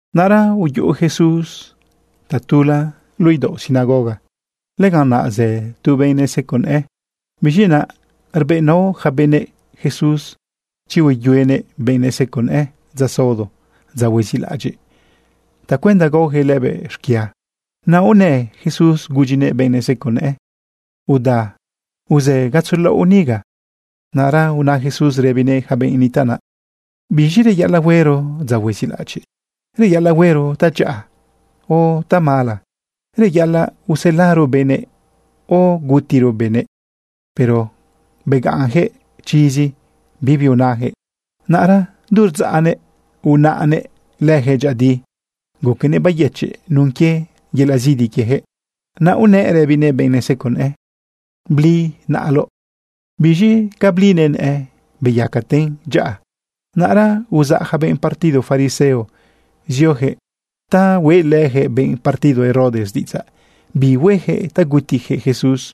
Naꞌra uyuꞌu Jesús tatula luꞌu idaoꞌ sinagoga. Lëganꞌ naꞌ zë tu benꞌ neseco nëꞌë. Biz̃i naꞌ rbëꞌnao yaca benëꞌ Jesús chi hueyuenëꞌ benꞌ neseco nëꞌë dza saodo, dza huezilaꞌadyiꞌ, tacuenda gaoyaquëꞌ lëbëꞌ xquia. Naꞌ unë Jesús gudyinëꞌ benꞌ neseco nëꞌë: ―Uda uzë gatzo laꞌo niga. Naꞌra una Jesús rëbinëꞌ yaca benꞌ nitaꞌ naꞌ: ―¿Biz̃i reyaꞌalaꞌ huero dza huezilaꞌadyiꞌ? ¿Reyaꞌalaꞌ huero tadyaꞌa o tamala? ¿Reyaꞌalaꞌ uselaro benëꞌ o gutiro benëꞌ? Pero begaꞌnyaquëꞌ chizi, bibi unayaquëꞌ. Naꞌra du rdzaꞌnëꞌ unaꞌnëꞌ leyaquëꞌ dyëꞌëdi. Guquenëꞌ bayëchiꞌ nun quie yelaꞌ zidi quieyaquëꞌ. Naꞌ unëꞌ rëbinëꞌ benꞌ neseco nëꞌë: ―Bli naꞌaloꞌ. Biz̃i ca blinëꞌ nëꞌë beyacaten dyaꞌa. Naꞌra uzaꞌ yaca benꞌ partido fariseo zioyaquëꞌ ta hueꞌlëyaquëꞌ benꞌ partido Herodes diꞌidzaꞌ bi hueyaquëꞌ ta gutiyaquëꞌ Jesús.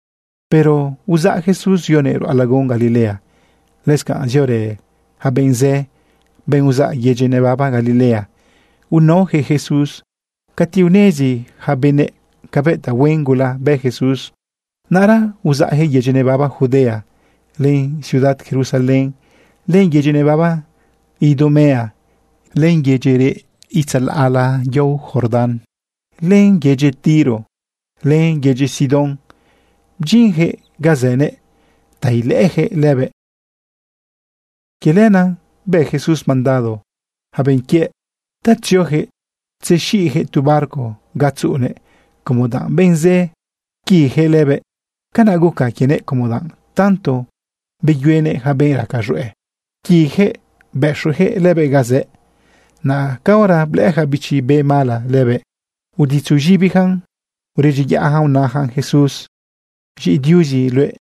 Pero uzaꞌ Jesús zionëꞌ ruꞌa lagun Galilea. Lëscanꞌ ziorë yaca benꞌ zë, benꞌ uzaꞌ yedyi nebaba Galilea, unaoyaquëꞌ Jesús. Cati unezi yaca benëꞌ cabëꞌ tahuen gula bë Jesús, naꞌra uzaꞌyaquëꞌ yedyi nebaba Judea, len ciudad Jerusalén, len yedyi nebaba Idumea, len yedyi reꞌ itzalaꞌla yao Jordán, len yedyi Tiro, len yedyi Sidón, bdyinyaquëꞌ ga zënëꞌ ta ilëꞌëyaquëꞌ lëbëꞌ. Quie lenaꞌ bë Jesús mandado yaca benꞌ quiëꞌ ta tzioyaquëꞌ tzexiꞌyaquëꞌ tu barco ga tzuꞌunëꞌ como danꞌ benꞌ zë pquiyaquëꞌ lëbëꞌ. Canaꞌ guca quienëꞌ como danꞌ tanto beyuenëꞌ yaca benꞌ raca z̃hueꞌ, pquiyaquëꞌ bëxuyaquëꞌ lëbëꞌ ga zëꞌ. Naꞌ caora blëꞌë yaca bichi be mala lëbëꞌ, uditzu z̃ibiyacan uredyiyaꞌyacan unayacan Jesús: ―Z̃iꞌi Diuzi luëꞌ.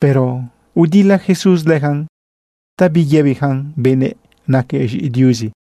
Pero udila Jesús leyacan ta biyëbiyacan benëꞌ naquëꞌ z̃iꞌi Diuzi.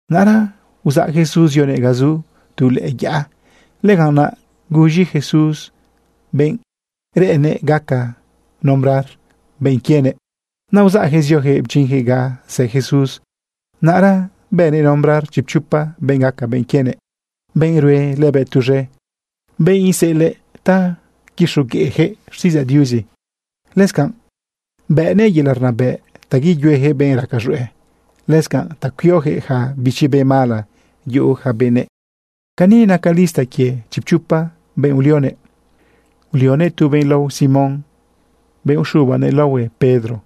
Naꞌra uzaꞌ Jesús zionëꞌ ga zu tu lëꞌë yaꞌa. Lëganꞌ naꞌ guz̃i Jesús benꞌ reꞌennëꞌ gaca nombrar benꞌ quienëꞌ. Naꞌ uzaꞌyaquëꞌ zioyaquëꞌ bdyinyaquëꞌ ga zë Jesús. Naꞌra bënëꞌ nombrar chipchopa benꞌ gaca benꞌ quienëꞌ, benꞌ rue lëbëꞌ tuz̃e, benꞌ iseꞌelaꞌ ta quixogueꞌyaquëꞌ xtiꞌidzaꞌ Diuzi. Lëscanꞌ bëꞌnëꞌ yelaꞌ rnabëꞌ ta yeyueyaquëꞌ benꞌ raca z̃hueꞌ, lëscanꞌ ta cuioyaquëꞌ yaca bichi be mala yuꞌu yaca benëꞌ. Cani naca lista quie chipchopa benꞌ ulionëꞌ: Ulionëꞌ tu benꞌ lao Simón, benꞌ uxubanëꞌ laohuëꞌ Pedro.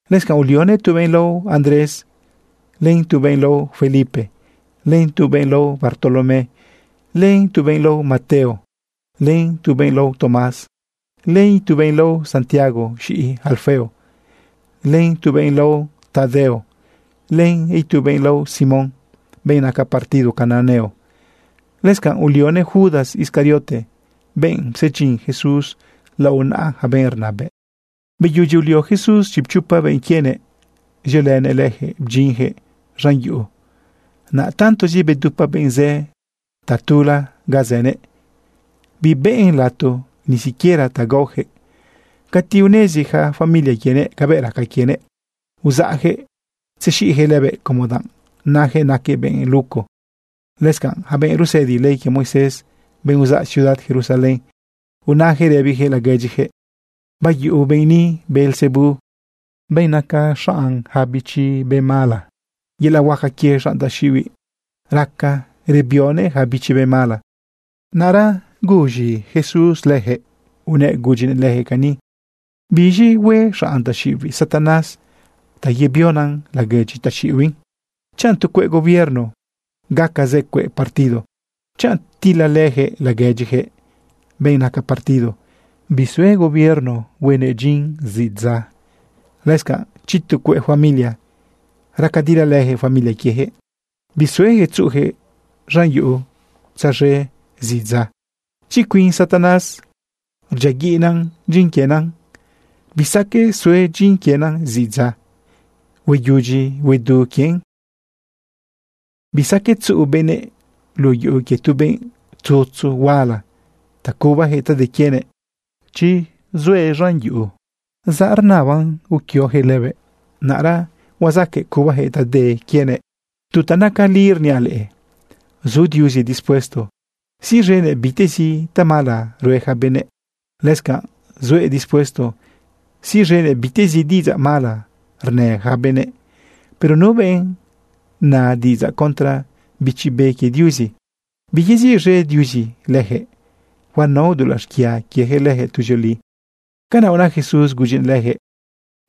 Lëscanꞌ ulionëꞌ tu benꞌ lao Andrés, len tu benꞌ lao Felipe, len tu benꞌ lao Bartolomé, len tu benꞌ lao Mateo, len tu benꞌ lao Tomás, len itu benꞌ lao Santiago, z̃iꞌi Alfeo, len tu benꞌ lao Tadeo, len itu benꞌ lao Simón, benꞌ naca partido cananeo. Lëscanꞌ ulionëꞌ Judas Iscariote, benꞌ psedyin Jesús lao naꞌa yaca benꞌ rnabëꞌ. Beyudyi ulio Jesús chipchopa benꞌ quienëꞌ, ziolënëꞌ leyaquëꞌ bdyinyaquëꞌ z̃an yuꞌu. Naꞌ tantozi bedupa benꞌ zë tatula ga zënëꞌ, bibëꞌn lato ni siquiera ta gaoyaquëꞌ. Cati unezi yaca familia quienëꞌ cabëꞌ raca quienëꞌ, uzaꞌyaquëꞌ tzexiꞌyaquëꞌ lëbëꞌ, como danꞌ nayaquëꞌ naquëꞌ benꞌ luco. Lëscanꞌ yaca benꞌ rusëdi ley quie Moisés, benꞌ uzaꞌ ciudad Jerusalén, unayaquëꞌ rëbiyaquëꞌ laguedyiyaquëꞌ: ―Bayuꞌu benꞌ ni Beelzebú, benꞌ naca xanꞌ yaca bichi be mala. Yelaꞌ huaca quie xanꞌ taxiꞌibiꞌ raca rbionëꞌ yaca bichi be mala. Naꞌra guz̃i Jesús leyaquëꞌ unëꞌ gudyinëꞌ leyaquëꞌ cani. ―¿Biz̃i hue xanꞌ taxiꞌibiꞌ Satanás ta yebionëꞌ laguedyi taxiꞌibiꞌ? Chanꞌ tu cueꞌ gobierno gaca zë cueꞌ partido, chanꞌ tilalëyaquëꞌ laguedyiyaquëꞌ benꞌ naca partido, bisue gobierno huen dyin zidza. Lëscanꞌ chi tu cueꞌ familia raca rdilalëyaquëꞌ familia quieyaquëꞌ, bisueyaquëꞌ tzuꞌuyaquëꞌ z̃an yuꞌu tzaz̃e zidza. Chi cuin Satanás rdyiaguiꞌnan dyin quienan, bisaqueꞌ sue dyin quienan zidza, hueyudyi huedu quien. ’Bisaqueꞌ tzuꞌu benëꞌ luꞌu yuꞌu quie tu benꞌ tzutzu huala ta cubayaquëꞌ ta de quienëꞌ chi zuëꞌ z̃an yuꞌu. Tanëro rnaban uquioyaquëꞌ lëbëꞌ, naꞌra huazaqueꞌ cubayaquëꞌ ta de quienëꞌ. ’Tu ta naca li rniaꞌ leꞌe, zu Diuzi dispuesto siꞌz̃enëꞌ bitezi tamala rue yaca benëꞌ. Lëscanꞌ zuëꞌ dispuesto siꞌz̃enëꞌ bitezi diꞌidzaꞌ mala rnë yaca benëꞌ, pero nu benꞌ na diꞌidzaꞌ contra Bichi Be quie Diuzi, biyeziꞌz̃e Diuzi leyaquëꞌ, huanao dulaꞌ xquia quieyaquëꞌ leyaquëꞌ tuzioli. Canaꞌ una Jesús gudyinëꞌ leyaquëꞌ,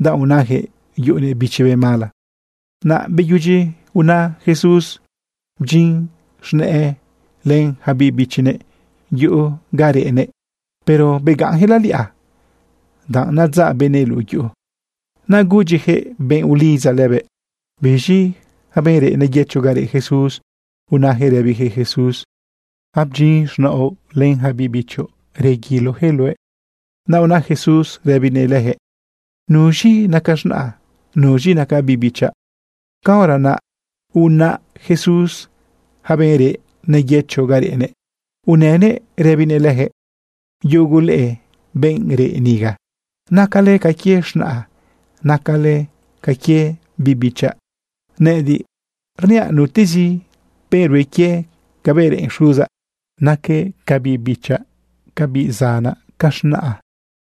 danꞌ unayaquëꞌ yuꞌunëꞌ bichi be mala. Naꞌ beyudyi una Jesús, bdyin z̃nëꞌë len yaca biꞌ bichinëꞌ yuꞌu ga reꞌnëꞌ, pero begaꞌnyaquëꞌ laliꞌa danꞌ nadzaꞌ benëꞌ luꞌu yuꞌu. Naꞌ gudyiyaquëꞌ benꞌ ulidza lëbëꞌ. Biz̃i yaca benꞌ reꞌ neyëcho ga reꞌ Jesús unayaquëꞌ rëbiyaquëꞌ Jesús: ―Abdyin z̃naoꞌ len yaca biꞌ bichoꞌ, rguiloyaquëꞌ luëꞌ. Naꞌ una Jesús rëbinëꞌ leyaquëꞌ: ―¿Nuz̃i naca z̃naꞌa? ¿Nuz̃i naca biꞌ bichaꞌ? Caora naꞌ unaꞌ Jesús yaca benꞌ reꞌ neyëcho ga reꞌnëꞌ, unënëꞌ rëbinëꞌ leyaquëꞌ: ―Yugu leꞌe benꞌ reꞌ niga, nacale ca quie z̃naꞌa, nacale ca quie biꞌ bichaꞌ. Nëꞌëdiꞌ rniaꞌ nutezi benꞌ rue quie cabëꞌ reꞌen Xuzaꞌ, naquëꞌ ca biꞌ bichaꞌ, ca biꞌ zanaꞌ, ca z̃naꞌa.